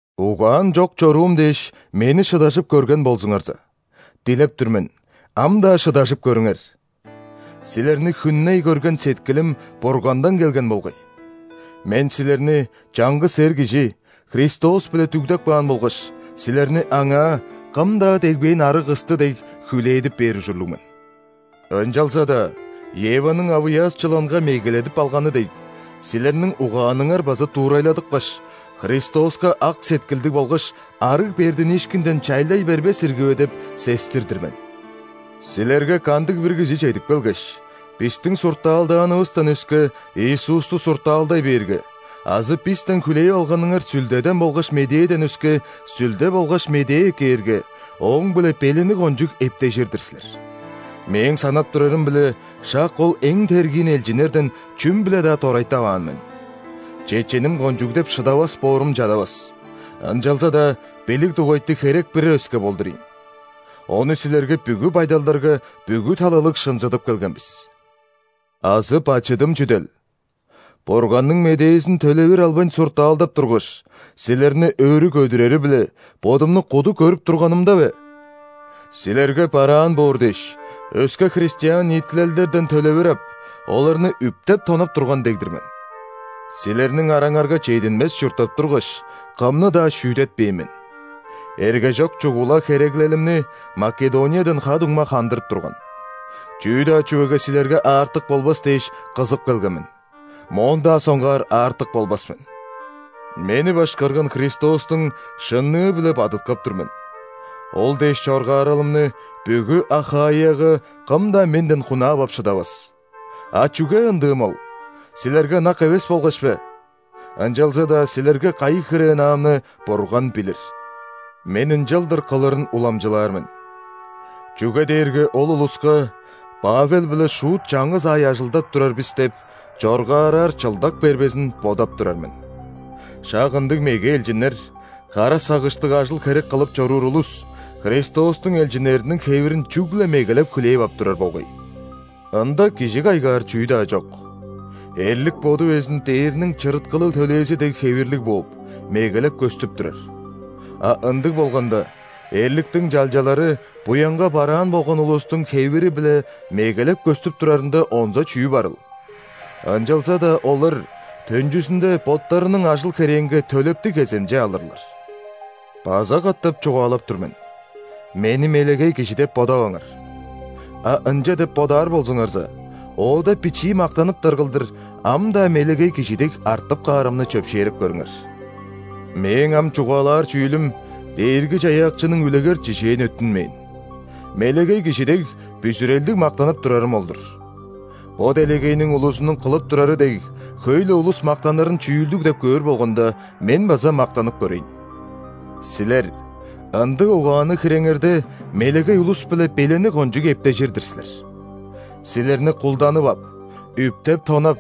Угаан чок чоруум дээш, мени шыдажып көрген болзуңарза! Дилеп тур мен: ам-даа шыдажып көрүңер! Силерни хүнней көрген сеткилим Бургандан келген болгай. Мен силерни чаңгыс Эр кижи – Христос-биле дүгдеп каан болгаш, силерни Аңаа, кым-даа дегбээн арыг кысты дег, хүлээдип бээр ужурлуг мен. Ынчалза-даа, Еваның авыяас чыланга мегеледип алганы дег, силерниң угааныңар база дуурайладыпкаш, Христоска ак сеткилдиг болгаш арыг бердиниишкинден чайлай бербес ирги бе деп сестир-дир мен. Силерге кандыг-бир кижи чедип келгеш, бистиң суртаалдаанывыстан өске Иисусту суртаалдай бээрге азы бистен хүлээп алганыңар Сүлдеден болгаш Медээден өске сүлде болгаш медээ эккээрге, ооң-биле белени кончуг эптежир-дир силер! Мээң санап турарым-биле, шак ол эң тергиин элчиннерден чүм-биле-даа дорайтаваан мен! «Чеченим кончуг» деп шыдавас боорум чадавас, ынчалза-даа билиг дугайты херек бир өске болдур ийин. Ону силерге бүгү байдалдарга бүгү талалыг шынзыдып келген бис! Азы бачыдым чүдел? Бурганның Медээзин төлевир албайн суртаалдап тургаш, силерни өрү көдүрери-биле, бодумну куду көрүп турганымда бе? Силерге бараан боор дээш, өске христиан ниитилелдерден төлевир ап, оларны үптеп-тонап турган дег-дир мен. Силерниң араңарга чединмес чурттап тургаш, кымны-даа шүүдетпээн мен. Эргежок чугула хереглелимни Македониядан ха-дуңма хандырып турган. Чүү-даа чүвеге силерге аартык болбас дээш кызып келген мен, моон-даа соңгаар аартык болбас мен. Мени башкарган Христостуң шынныы-биле бадыткап тур мен: ол дээш чоргааралымны бүгү Ахаияга кым-даа менден хунаап ап шыдавас! А чүге ындыым ол? Силерге ынак эвес болгаш бе? Ынчалза-даа силерге кайы хире ынаамны Бурган билир! Мен ынчалдыр кылырын уламчылаар мен, чүге дээрге ол улуска «Павел-биле шуут чаңгыс аай ажылдап турар бис» деп чоргаараар чылдак бербезин бодап турар мен. Шак ындыг меге элчиннер, кара сагыштыг ажыл-херек кылып чоруур улус, Христостуң элчиннериниң хевирин чүгле мегелеп хүлээп ап турар болгай. Ында кижи кайгаар чүү-даа чок: эрлик боду безин дээрниң чырыткылыг төлээзи дег хевирлиг бооп, мегелеп көстүп турар. А ындыг болганда, эрликтиң чалчалары буянга бараан болган улустуң хевири-биле мегелеп көстүп турарында онза чүү барыл? Ынчалза-даа олар төнчүзүнде боттарының ажыл-херээнге төлептиг кеземче алырлар! База катап чугаалап тур мен: мени мелегей кижи деп бодаваңар! А ынча деп бодаар болзуңарза, оода бичии мактаныптар кылдыр, ам-даа мелегей кижи дег артып каарымны чөпшээреп көрүңер. (Мээң ам чугаалаар чүүлүм Дээрги-Чаяакчының үлегер-чижээн өттүнмээн: мелегей кижи дег, бүзүрелдиг мактанып турарым ол-дур. Бо делегейниң улузунуң кылып турары дег, хөй-ле улус мактанырын чүүлдүг деп көөр болганда, мен база мактанып көрейн.) Силер, ындыг угаанныг хиреңерде, мелегей улус-биле белени кончуг эптежир-дир силер! Силерни кулданып ап, үптеп-тонап,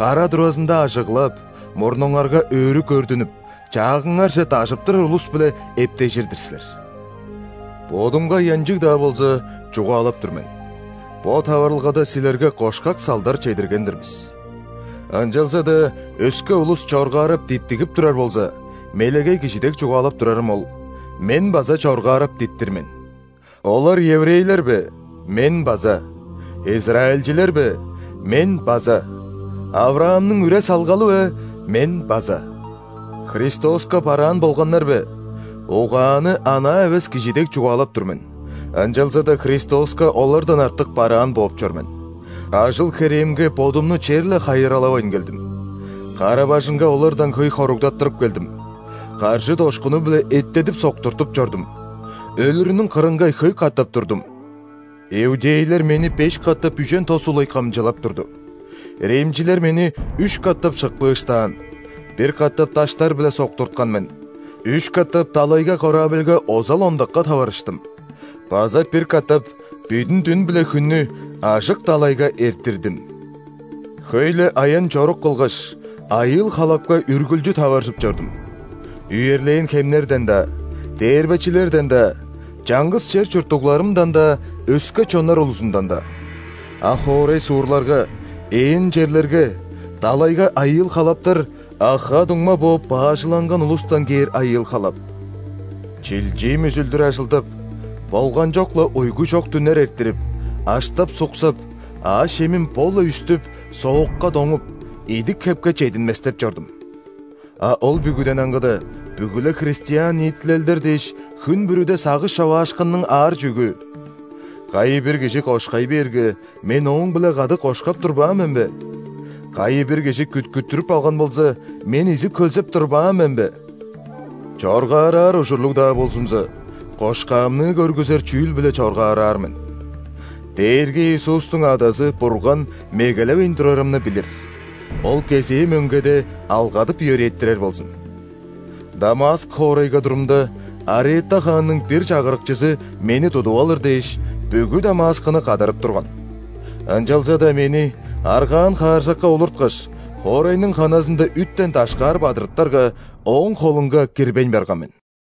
кара туразында ажыглап, мурнуңарга өрү көрдүнүп, чаагыңарже дажып турар улус-биле эптежир-дир силер. Бодумга ыянчыг-даа болза, чугаалап тур мен: бо таварылгада силерге кошкак салдар чедирген-дир бис! Ынчалза-даа өске улус чоргаарап диттигип турар болза (мелегей кижи дег чугаалап турарым ол), мен база чоргаарап диттир мен. Олар еврейлер бе? Мен база! Израильчилер бе? Мен база! ·Авраамның үре-салгалы бе? Мен база! Христоска бараан болганнар бе? Угааны анаа эвес кижи дег чугаалап тур мен, ынчалза-даа Христоска олардан артык бараан бооп чор мен! Ажыл-херээмге бодумну черле хайыралавайн келдим, кара-бажыңга олардан хөй хоругдаттырып келдим, каржы-дошкуну-биле эттедип-соктуртуп чордум, өлүрүнүң кырынга хөй катап турдум. Иудейлер мени беш катап үжен тос улай кымчылап турду. Римчилер мени үш катап шыкпыыштаан; бир катап даштар-биле соктурткан мен; үш катап далайга корабльга озал-ондакка таварыштым база бир катап бүдүн дүн биле хүннү ажык далайга эрттирдим. Хөй-ле аян-чорук кылгаш, айыыл-халапка үргүлчү таваржып чордум: үерлээн хемнерден-даа, дээрбечилерден-даа, чаңгыс чер чурттугларымдан-даа, өске чоннар улузундан-даа. А хоорай-суурларга, ээн черлерге, далайга айыыл-халаптар; а ха-дуңма бооп баажыланган улустан кээр айыыл-халап? Чилчиим үзүлдүр ажылдап, болганчок-ла уйгу чок дүннер эрттирип, аштап-суксап, аъш-чемим бо-ла үстүп, соокка доңуп, идик-хепке чединместеп чордум. А ол бүгүден аңгыда, бүгү-ле христиан ниитилелдер дээш, хүн бүрүде сагыш човаашкынның аар чүъгү! Кайы-бир кижи кошкай бээрге, мен ооң-биле кады кошкап турбаан мен бе? Кайы-бир кижи күткүттүрүп алган болза, мен изип-хөлзеп турбаан мен бе? Чоргаараар ужурлуг-даа болзумза, кошкаамны көргүзер чүүл-биле чоргаараар мен. Дээрги Иисустуң Адазы Бурган мегелевейн турарымны билир, Ол кезээ мөңгеде алгадып-йөрээттирер болзун! Дамаск хоорайга турумда, Арета хаанның бир чагырыкчызы мени тудуп алыр дээш, бүгү Дамаскыны кадарып турган. Ынчалза-даа мени, аргаан хааржакка олурткаш, хоорайның ханазында үттен дашкаар бадырыптарга, ооң холунга кирбейн барган мен!